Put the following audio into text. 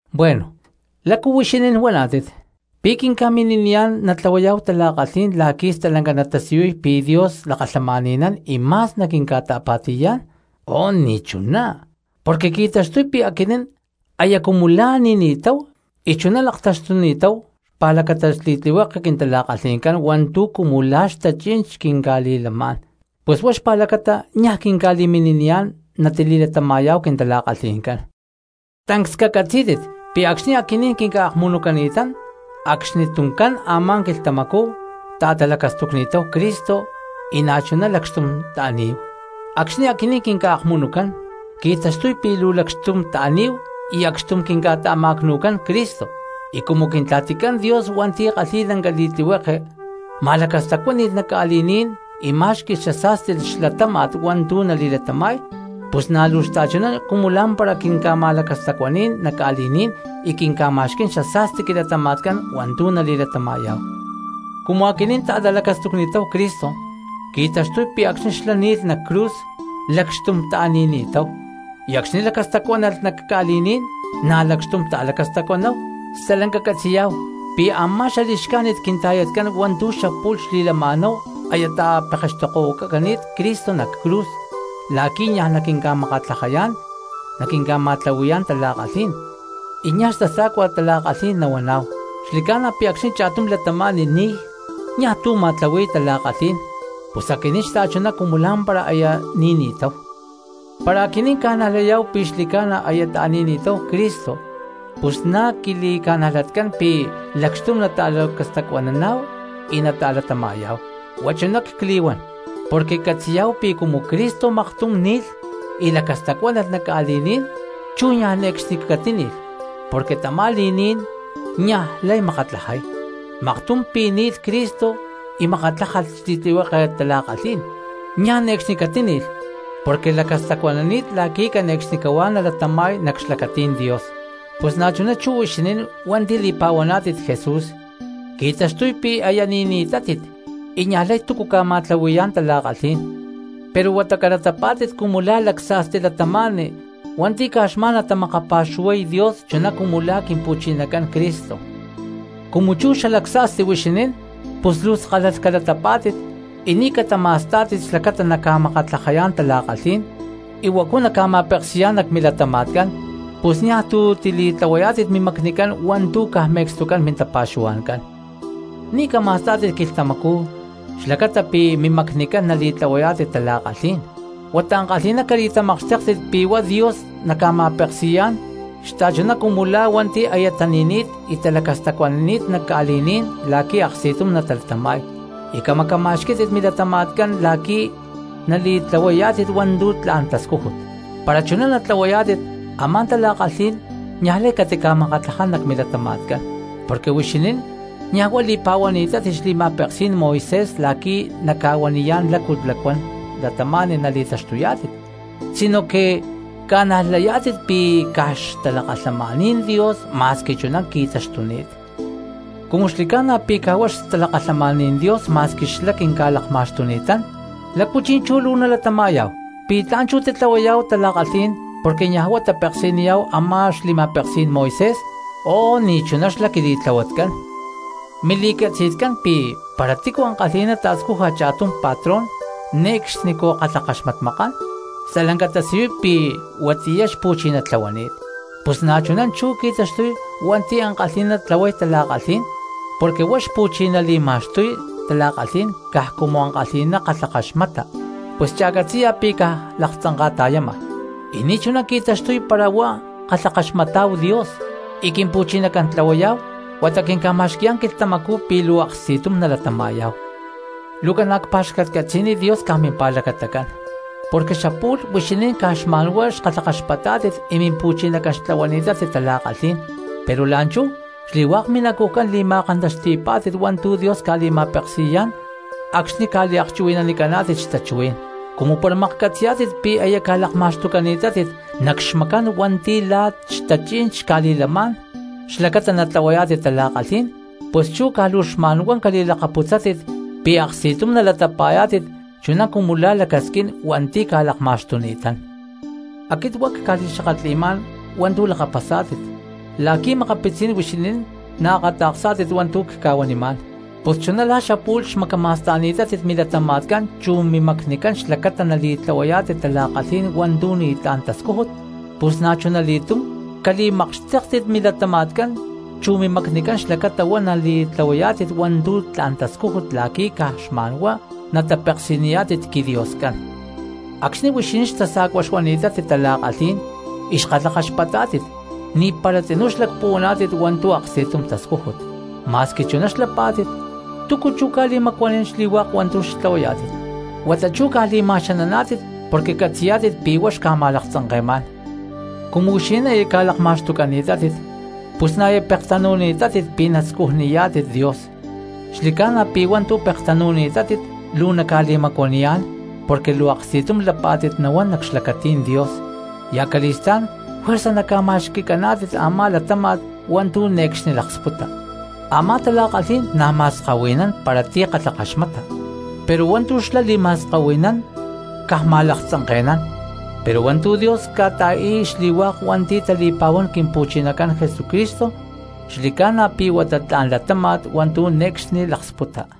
Bueno, ¿lácu huixinín huaná̠tit? ¿Pi̠ quinca̠mini̠niyá̠n natlahuayá̠hu tala̠kalhí̠n la̠qui̠ stalanca natasiyuy pi̠ Dios lakalhamani̠nán y ma̠s naquincata̠pa̠ti̠yá̠n? ¡Oh, ni̠chuná! Porque qui̠taxtuy pi̠ aquinín aya cumu la̠ ni̠ni̠táhu y chuná laktaxtuni̠táhu xpa̠lacata xli̠tlihueke quintala̠kalhi̠ncán hua̠ntu̠ cumu la̠ xtachí̠n quinca̠kalhi̠yá̠n, pus huá xpa̠lacata niaj quinca̠li̠mini̠niyá̠n natili̠latama̠yá̠hu quintala̠kalhi̠ncán. Porque tancs cacatzí̠tit pi̠ acxni̠ aquinín quinca̠akmunucani̠tán acxnituncán a̠má quilhtamacú ta̠talacastucni̠táhu Cristo y na̠chuná lacxtum ta̠ní̠hu. Acxni̠ aquinín quinca̠akmunucán qui̠taxtuy pi̠ luu lacxtum ta̠ní̠hu y acxtum quinca̠ta̠ma̠cnu̠cán Cristo, y cumu Quintla̠ticán Dios hua̠nti̠ kalhi̠y lanca li̠tlihueke ma̠lacastacuáni̠lh nac ca̠li̠ní̠n y má̠xqui̠lh xasa̠sti xlatáma̠t hua̠ntu̠ nali̠latama̠y, pus na̠ luu xta̠chuná cumu lá̠mpara quinca̠ma̠lacastacuaní̠n nac ca̠li̠ní̠n y quinca̠ma̠xquí̠n xasa̠sti quilatama̠tcán hua̠ntu̠ nali̠latama̠yá̠hu. Cumu aquinín ta̠talacastucni̠táhu Cristo, qui̠taxtuy pi̠ acxni̠ xlá ni̠lh nac cruz lacxtum ta̠ni̠ni̠táhu, y acxni̠ lacastacuánalh nac ca̠li̠ní̠n na̠ lacxtum ta̠lacastacuanáhu. Stalanca catzi̠yá̠hu pi̠ a̠má xali̠xcájnit quinta̠yatcán hua̠ntu̠ xapu̠lh xli̠lama̠náhu aya ta̠tapekextokohuacani̠t Cristo nac cruz la̠qui̠ niaj naquinca̠makatlajayá̠n naquinca̠ma̠tlahui̠yá̠n tala̠kalhí̠n, y niaj xtasa̠cua tala̠kalhí̠n nahuaná̠hu. Xli̠ca̠na pi̠ acxni̠ cha̠tum cristiano ni̠y niaj tu̠ ma̠tlahui̠y tala̠kalhí̠n, pus aquinín xta̠chuná cumu lá̠mpara aya ni̠ni̠táhu. Para aquinín ca̠najlayá̠hu pi̠ xli̠ca̠na aya ta̠ni̠ni̠táhu Cristo, pus na̠ quili̠ca̠najlatcán pi̠ lacxtum nata̠lacastacuananá̠hu y nata̠latama̠yá̠hu. Huá chuná cli̠huán porque catzi̠yá̠hu pi̠ cumu Cristo maktum ni̠lh y lacastacuánalh nac ca̠li̠ní̠n, chú niaj ne̠cxni catíni̠lh porque tamá li̠ní̠n niajlay makatlajay. Maktum pi̠ ni̠lh Cristo y makatlájalh xli̠tlihueke tala̠kalhí̠n, niaj ne̠cxni catíni̠lh porque lacastacuanani̠t la̠qui̠ cane̠cxnicahuá nalatama̠y nac xlacatí̠n Dios. Pus na̠chuná chú huixinín hua̠nti̠ li̠pa̠huaná̠tit Jesús qui̠taxtuy pi̠ aya ni̠ni̠tátit y niajlay túcu ca̠ma̠tlahui̠yá̠n tala̠kalhí̠n, pero huata calatapá̠tit cumu la̠ lacsa̠sti cristianos hua̠nti̠ caj xma̠n natamakapa̠xuhuay Dios chuná cumu la̠ Quimpu̠chinacán Cristo. Cumu xalacsa̠sti cristianos huixinín, pus luu skálalh calatapá̠tit y ni̠ catama̠stá̠tit xlacata naca̠makatlajayá̠n tala̠kalhí̠n y huacu naca̠ma̠peksi̠yá̠n nac milatama̠tcán; pus niaj tu̠ tili̠tlahuayá̠tit mimacnicán hua̠ntu̠ caj me̠cstucán mintapa̠xuhua̠ncán. Ni̠ cama̠stá̠tit quilhtamacú xlacata pi̠ mimacnicán nali̠tlahuayá̠tit tala̠kalhí̠n, huata ankalhi̠ná cali̠tamakxtéktit pi̠ huá Dios naca̠ma̠peksi̠yá̠n xta̠chuná cumu la̠ hua̠nti̠ aya tani̠ni̠t y talacastacuanani̠t nac ca̠li̠ní̠n la̠qui̠ aksti̠tum natalatama̠y, y camacama̠xquí̠tit milatama̠tcán la̠qui̠ nali̠tlahuayá̠tit hua̠ntu̠ tla̠n tascújut. Para chuná natlahuayá̠tit a̠má tala̠kalhí̠n niajlay catica̠makatlaján nac milatama̠tcán, porque huixinín niaj huá li̠pa̠huaná̠tit xli̠ma̠peksí̠n Moisés la̠qui̠ naca̠huaniyá̠n lácu lacuán cristianos nali̠taxtuyá̠tit, sinoque porque ca̠najlayá̠tit pi̠ caj xtalakalhamaní̠n Dios ma̠squi chuná qui̠taxtuni̠t. Cumu xli̠ca̠na pi̠ caj huá xtalakalhamaní̠n Dios ma̠squi xlá quinca̠lakma̠xtuni̠tán, ¿lácu chi̠nchú luu nalatama̠yá̠hu? ¿Pi̠ tla̠n chú titlahuayá̠hu tala̠kalhí̠n porque niaj huá tapeksi̠niyá̠hu a̠má xli̠ma̠peksí̠n Moisés? ¡Oh, ni̠chuná xlá quili̠tlahuatcán! Huixinín catzi̠yá̠tit pi̠ para tícu ankalhi̠ná ta̠scuja cha̠tum patrón ne̠cxnicú kalhakaxmatmakán, stalanca tasiyuy pi̠ huatiyá xpu̠chiná tlahuani̠t. Pus na̠chuná chú qui̠taxtuy hua̠nti̠ ankalhi̠ná tlahuay tala̠kalhí̠n, porque hua̠nti̠ xpu̠chiná li̠ma̠xtuy tala̠kalhí̠n caj cumu ankalhi̠ná kalhakaxmata, pus cha̠catzi̠ya pi̠ caj laktzanka̠ta̠yama, y ni̠chuná qui̠taxtuy para huá kalhakaxmatá̠hu Dios y Quimpu̠chinacán tlahuayá̠hu, huata quinca̠ma̠xqui̠yá̠n quilhtamacú pi̠ luu aksti̠tum nalatama̠yá̠hu. Luu ca̠na̠ cpa̠xcatcatzi̠niy Dios caj mimpa̠lacatacán, porque xapu̠lh huixinín caj xma̠nhuá xkalhakaxpatá̠tit y mimpu̠chinacán xtlahuani̠tátit tala̠kalhí̠n, pero la̠nchú xli̠hua̠k minacujcán li̠ma̠kantaxti̠pá̠tit hua̠ntu̠ Dios ca̠li̠ma̠peksi̠yá̠n acxni̠ ca̠liakchuhui̠nanicaná̠tit xtachuhuí̠n. Cumu para maklhcatzi̠yá̠tit pi̠ aya ca̠lakma̠xtucani̠tátit nac xmacán hua̠nti̠ la̠ xtachí̠n xca̠li̠lamá̠n xlacata natlahuayá̠tit tala̠kalhí̠n, pus chú caj luu xma̠nhuá cali̠lakaputzátit pi̠ aksti̠tum nalatapa̠yá̠tit chuná cumu la̠ lacasquín hua̠nti̠ ca̠lakma̠xtuni̠tán. (Aquit huá cca̠li̠xakatli̠má̠n hua̠ntu̠ lakapasá̠tit porque makapitzí̠n huixinín chuná naakata̠ksá̠tit hua̠ntu̠ cca̠huanimá̠n.) Pus chuná la̠ xapu̠lh xmacama̠sta̠ni̠tátit milatama̠tcán chu mimacnicán xlacata nali̠tlahuayá̠tit tala̠kalhí̠n y hua̠ntu̠ ni̠tlá̠n tascújut, pus na̠chuna li̠túm cali̠makxtéktit milatama̠tcán chu mimacnicán xlacata huá nali̠tlahuayá̠tit hua̠ntu̠ tla̠n tascújut la̠qui̠ caj xma̠nhuá natapeksi̠niyá̠tit quiDioscán. Acxni̠ huixinín xtasa̠cuá̠n xuani̠tátit tala̠kalhí̠n porque xkalhakaxpatá̠tit, ni̠para tzinú xlacpuhuaná̠tit hua̠ntu̠ aksti̠tum tascújut. Ma̠squi̠ chuná xlapá̠tit, ¿túcu chú ca̠li̠macuanín xli̠hua̠k hua̠ntu̠ xtlahuayá̠tit? Huata chú caj li̠ma̠xananá̠tit porque catzi̠yá̠tit pi̠ huá xca̠ma̠laktzanke̠má̠n. Cumu huixinín aya ca̠lakma̠xtucani̠tátit pus na̠ aya pektanu̠ni̠tátit pi̠ nascujniyá̠tit Dios, xli̠ca̠na pi̠ u̠má hua̠ntu̠ pektanu̠ni̠tátit luu naca̠li̠macuaniyá̠n porque luu aksti̠tum lapá̠tit nahuán nac xlacatí̠n Dios, y acali̠stá̠n juerza naca̠ma̠xqui̠caná̠tit a̠má latáma̠t hua̠ntu̠ ne̠cxni laksputa. Amá tala̠kalhí̠n na̠ ma̠skahui̠nán para ti̠ kalhakaxmata, pero hua̠ntu̠ xlá li̠ma̠skahui̠nán caj ma̠laktzanke̠nán, pero hua̠ntu̠ Dios ca̠ta̠i̠y xli̠hua̠k hua̠nti̠ tali̠pa̠huán Quimpu̠chinacán Jesucristo xli̠ca̠na pi̠ huá tla̠n latáma̠t hua̠ntu̠ ne̠cxni nalaksputa.